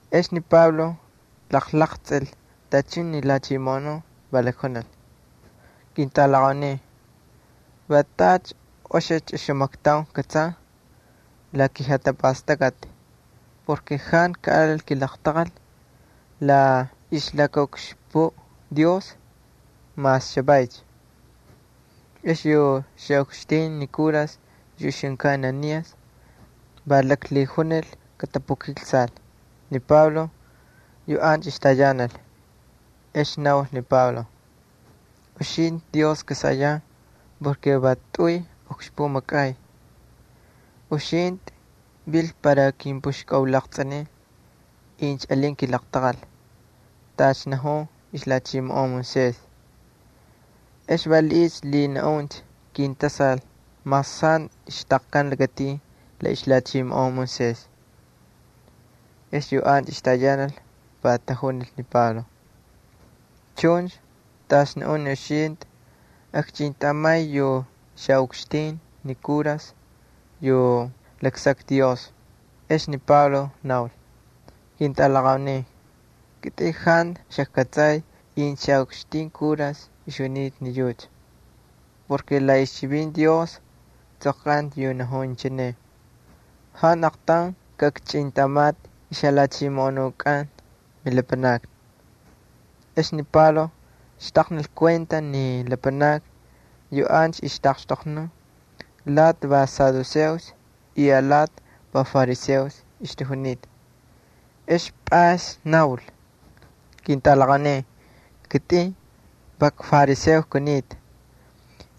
Ex ni Pablo jalaqtsꞌil tachun ni lhachimoꞌonun, va lakjunil: —Ketꞌalaqaunin, va tacha oxicha oxamaktaun kꞌatsan la kijatapastakꞌati porke jantu kaꞌalil kilaqtaqal la ixlakaꞌukxpuꞌ Dios mas chavaycha. Ex yu xaꞌukxtin ni kuras yu ixjunkan Ananías va laklhijunil katapukiksal ni Pablo yu ancha ixtayanal. Ex naul ni Pablo: —Uxintꞌi Dios kasayan, va tꞌuy ukxpuꞌ makꞌay. Uxintꞌi viltꞌi para kimpꞌuxkꞌaulaqtsꞌinin incha alin kilaqtaqal tacha najun ixlhachimoꞌon Moisés. ¿Ex valiꞌiycha lhinaꞌuncha kintasal mas jantu xtaqkan lakatin la ixlhachimoꞌon Moisés? Ex yu ancha ixtayanal va tajunil ni Pablo: —Chuncha tacha naꞌun ni uxintꞌi akchꞌintꞌamay yu xaꞌukxtin ni kuras yu laksakta Dios. Ex ni Pablo naul: —Ketꞌalaqaunin, kitꞌin jantu xajkꞌatsay incha xaꞌukxtin kura ixjunita. La ixchivinti Dios tsꞌoqkanta yu najun inchine: “Jantu aqtaun kaꞌakchꞌintꞌamatꞌi ixjalhachimoꞌonukꞌan milapanakni.” Ex ni Pablo xtaqnil kuenta ni lapanakni yu ancha ixtaꞌaqxtoqnun lati va saduceos y alati va fariseos ixtajunita. Ex pꞌays naul: —Ketꞌalaqaunin, kitꞌin va kfariseo kunita,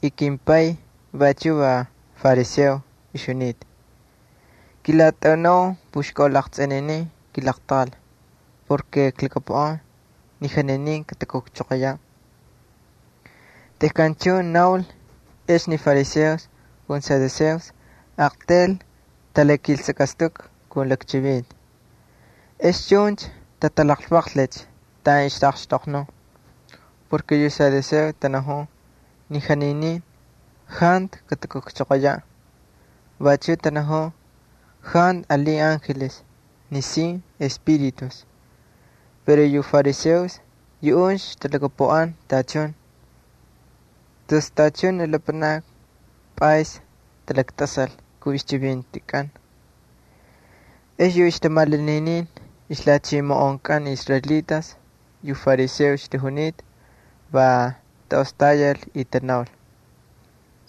y kimpay vachuꞌ va fariseo ixjunita. Kilatꞌaunau puxkaulaqtsꞌininin kilaqtaqal porke klhakapuꞌan ni janinin katakujchoqoyaꞌ. Tejkan chuncha naul, ex ni fariseos ali saduceos aqtayl talakiltsakꞌastukꞌa kun lakchivinti. Ex chuncha tatalaqlvaqlicha taꞌan ixtaꞌaqxtoqnun. Yu saduceos tanajun ni janinin jantu katakujchoqoyaꞌ vachuꞌ tanajun jantu alin angeles nisin espíritus, pero yu fariseos yuꞌuncha talhakapuꞌan tachun. Tus tachun ni lapanakni pꞌays talaktꞌasal kun ixchivintikꞌan. Ex yu ixtamasuy ixlhachimoꞌonkꞌan ni israelitas yu talhiyal ni fariseos va taꞌostayal y tanaul: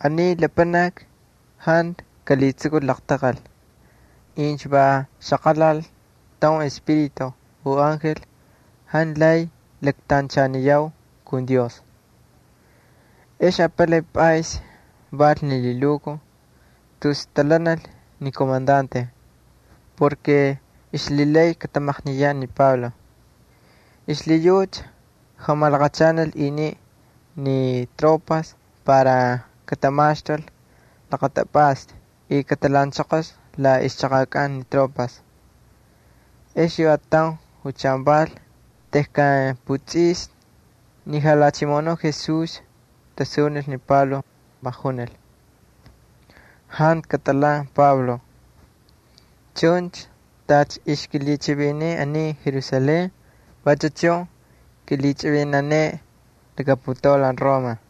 —Aniy lapanaki jantu kalhitsukul laqtaqal. Incha va xaqalal taun espíritu u angel jantu lay laktanchaniyau kun Dios. Ex apalay pꞌays val ni lhilukuj tus talhanal ni komandante porke ixlhilay katamaqniyaꞌ ni Pablo. Xlhiyucha jamalaqachanal iniꞌ ni tropas para katamaxtul laqatapꞌasta y katalhaꞌanchoqol la ixchaqakꞌan ni tropas. Ex yu ataun julchan val tejkan putsꞌisni, ni Jalhachimoꞌonuꞌ Jesús tasunil ni Pablo, va junil: —Jantu katꞌalhan Pablo, chuncha tacha ixkꞌilhichꞌiviniy aniy Jerusalén vachu chun kꞌilhichꞌivinaneꞌe laka putaulan Roma.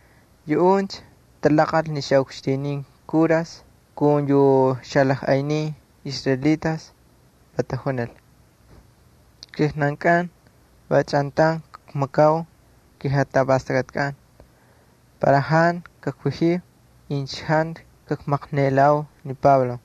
Yuꞌuncha talaqꞌal ni xaꞌukxtinin kuras kun yu xalajꞌaynin israelitas, va tajunil: —Kijnankꞌan va chꞌantaun kmakau kijatapastakꞌatkꞌan para jantu kakvajiu incha jantu kakmaqniꞌelau ni Pablo.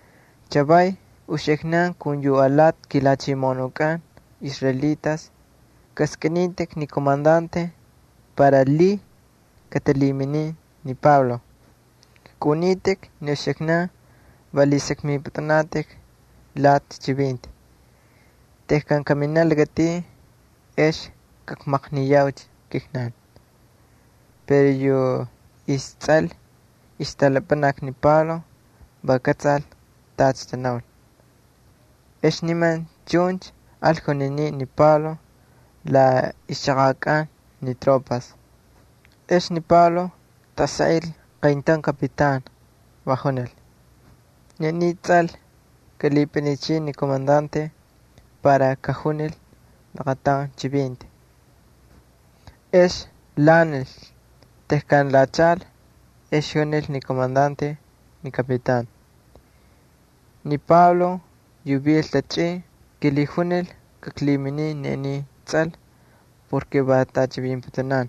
Chavay uxiknan kun yu alati kilhachimoꞌonunkꞌan israelitas kaskꞌinitꞌik ni komandante para lhiy katalhiminin ni Pablo. Kaꞌunitꞌik ni uxiknan va lhisakmipꞌutꞌunatꞌik alati chivinti. Tejkan kaminaꞌ lakatin ex kakmaqniyaucha kijnan. Pero yu istsꞌal ixtꞌalapanaki ni Pablo va kꞌatsal tacha tanaul. Ex niman chuncha al juniniꞌ ni Pablo la ixchaqakꞌan ni tropas. Ex ni Pablo tꞌasaꞌil qayntaun kapitan, va junil: —Ni aniy tsꞌal kalhipꞌinichiy ni komandante para kajunil laqataun chivinti. Ex lhaꞌanil, tejkan lhachaꞌal ex junil ni komandante ni kapitan: —Ni Pablo yu vil tachꞌin kilhijunil kaklhiminin ni aniy tsꞌal porke va tꞌachivinputunan.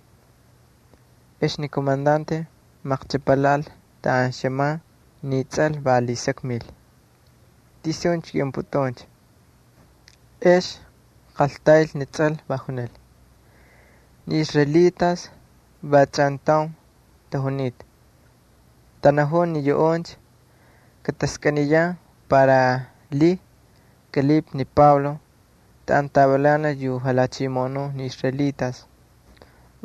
Ex ni komandante maqchꞌapalhaꞌal taꞌan xꞌaman ni tsꞌal, va lhisakmil: —¿Tisuncha kꞌiꞌunpꞌutꞌuncha? Ex qaltayl ni tsꞌal, va junil: —Ni israelitas va chꞌantaun tajunita. Tanajun ni yuꞌuncha kataskꞌiniyan para lhiy kꞌalhipꞌi ni Pablo taꞌan tavilanal yu xalhachimoꞌonun ni israelitas,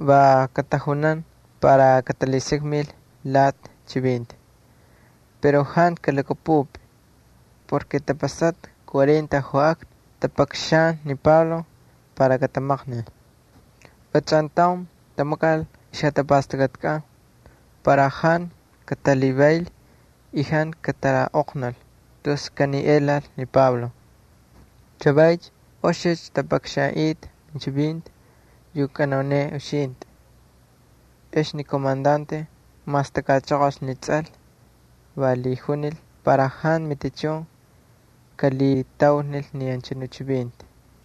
va katajunan para katalhisakmil alati chivinti. Pero jantu kalhakꞌapꞌupꞌi porke tapasata cuarenta joꞌakna tapakxan ni Pablo para katamaqnil. Va chꞌantaun tamakal ixjatapastakꞌatkꞌan para jantu katalhivayl y jantu kataꞌoqnul tus kaniꞌelal ni Pablo. Chavaycha oxicha tapakxanꞌita minchivinti yu kꞌanauneꞌe uxintꞌi. Ex ni komandante mastakꞌachoqolcha ni tsꞌal, va lhijunil para jantu matichun kalhitaulnil ni anchanu chivinti.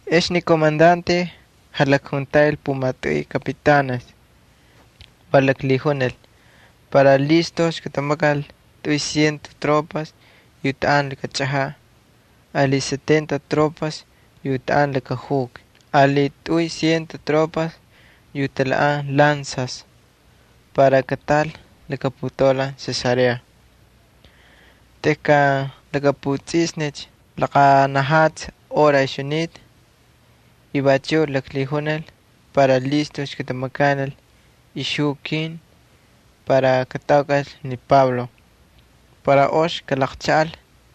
Ex ni komandante jalakjuntaꞌil pumatꞌuy kapitanes, va laklhijunil para listujcha katamakal tꞌuy ciento tropas yu taꞌan laka chꞌajaꞌ ali setenta tropas yu tapuꞌan laka juki ali tꞌuy ciento tropas yu talhaꞌan lanzas para kataꞌal laka putaulan Cesarea tejkan lakaputsꞌisni laqanajatsi hora ixjunita. Vachuꞌ laklhijunil para listujcha katamakanil ixjukin para kataukꞌal ni Pablo para ox kalaqchaꞌal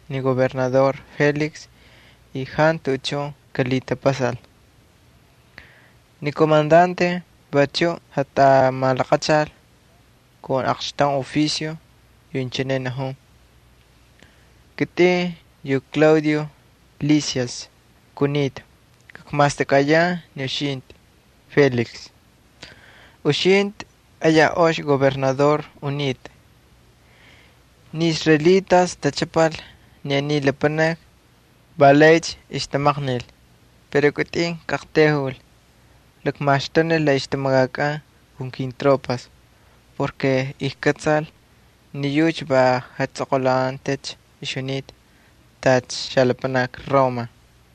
ni gobernador Félix y jantu tuꞌuchun kalhitapasal. Ni komandante vachuꞌ malaqachal aqxtaun jalhiki yu inchine najun: “Kitꞌin yu Claudio Lisias kunita, kmastakꞌayan ni uxintꞌi, Félix. Uxintꞌi ayaj ox gobernador unitꞌa. Ni israelitas tachꞌapal ni aniy lapanaki, va laycha ixtamaqnil pero kitꞌin kꞌaqtayjul, klakmaxtunil la ixtamakakꞌan kun kintropas porke ijkꞌatsal ni yucha va jatsꞌoqꞌulakantacha tacha xalapanaki Roma.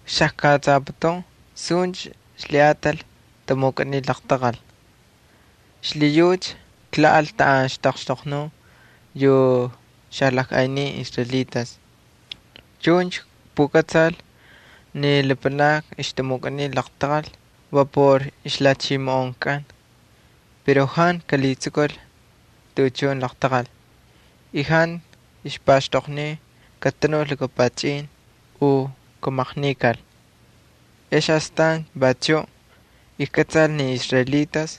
Xajkꞌatsaputun suncha ixlhiꞌatal tamukꞌaniy laqtaqal. Xlhiyucha klhaꞌal taꞌan ixtaꞌaqxtoqnun yu xalajꞌaynin israelitas. Chuncha kpukꞌatsal ni lapanakni ixtamukꞌaniy laqtaqal va por ixlhachimoꞌonkꞌan pero jantu kalhitsukul tuꞌuchun laqtaqal y jantu ixpaxtoqniy katanul laka pachꞌin u kamaqnikal. Ex astan vachuꞌ kꞌatsal ni israelitas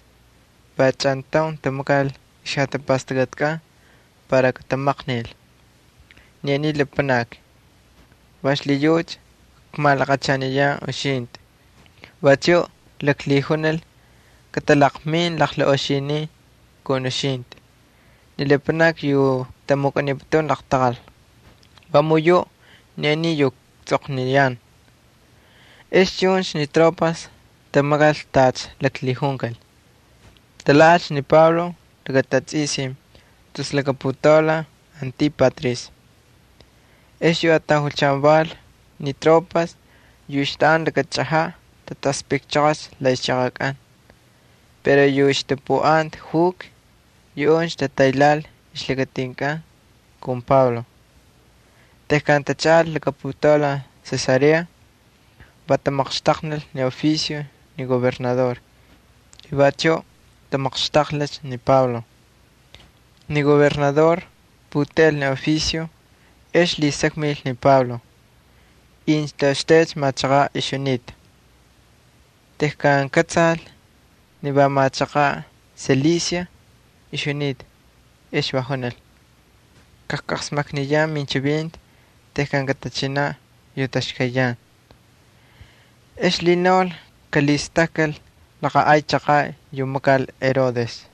va chꞌantaun tamakal ixjatapastakꞌatkꞌan para katamaqnil ni aniy lapanaki, va xlhiyucha kmalaqachaniyan uxintꞌi. Vachuꞌ klaklhijunil katalaqmin laqlaꞌoxinin kun uxintꞌi ni lapanakni yu tamukꞌaniputun laqtaqal. Vamun yuꞌ ni aniy yu ktsꞌoqniyan.” Ex chuncha ni tropas tamakal tacha laklhijunkal, talhaꞌalcha ni Pablo laka tatsꞌisin tus laka putaulan Antípatris. Ex yu ataun julchan val, ni tropas yu ixtaꞌanta laka chꞌajaꞌ tataspꞌikchoqolcha la ixchaqakꞌan, pero yu ixtapuꞌanta juki yuꞌuncha tataylhaꞌal ixlakatinkꞌan kun Pablo. Tejkan tachaꞌal laka putaulan Cesarea va tamaqxtaqnil ni jalhiki ni gobernador y vachuꞌ tamaqxtaqlhicha ni Pablo. Ni gobernador puteꞌel ni chivinti ex lhisakmil ni Pablo incha toꞌoxtaycha machaqaꞌ ixjunita. Tejkan kꞌatsal ni va machaqaꞌ Cilicia ixjunita ex va junil: —Kajqasmakniyan minchivinti tejkan katachinaꞌ yu taxkayyan. Ex lhinaul kalhistakkal laqa ay chaqaꞌ yu makal Herodes.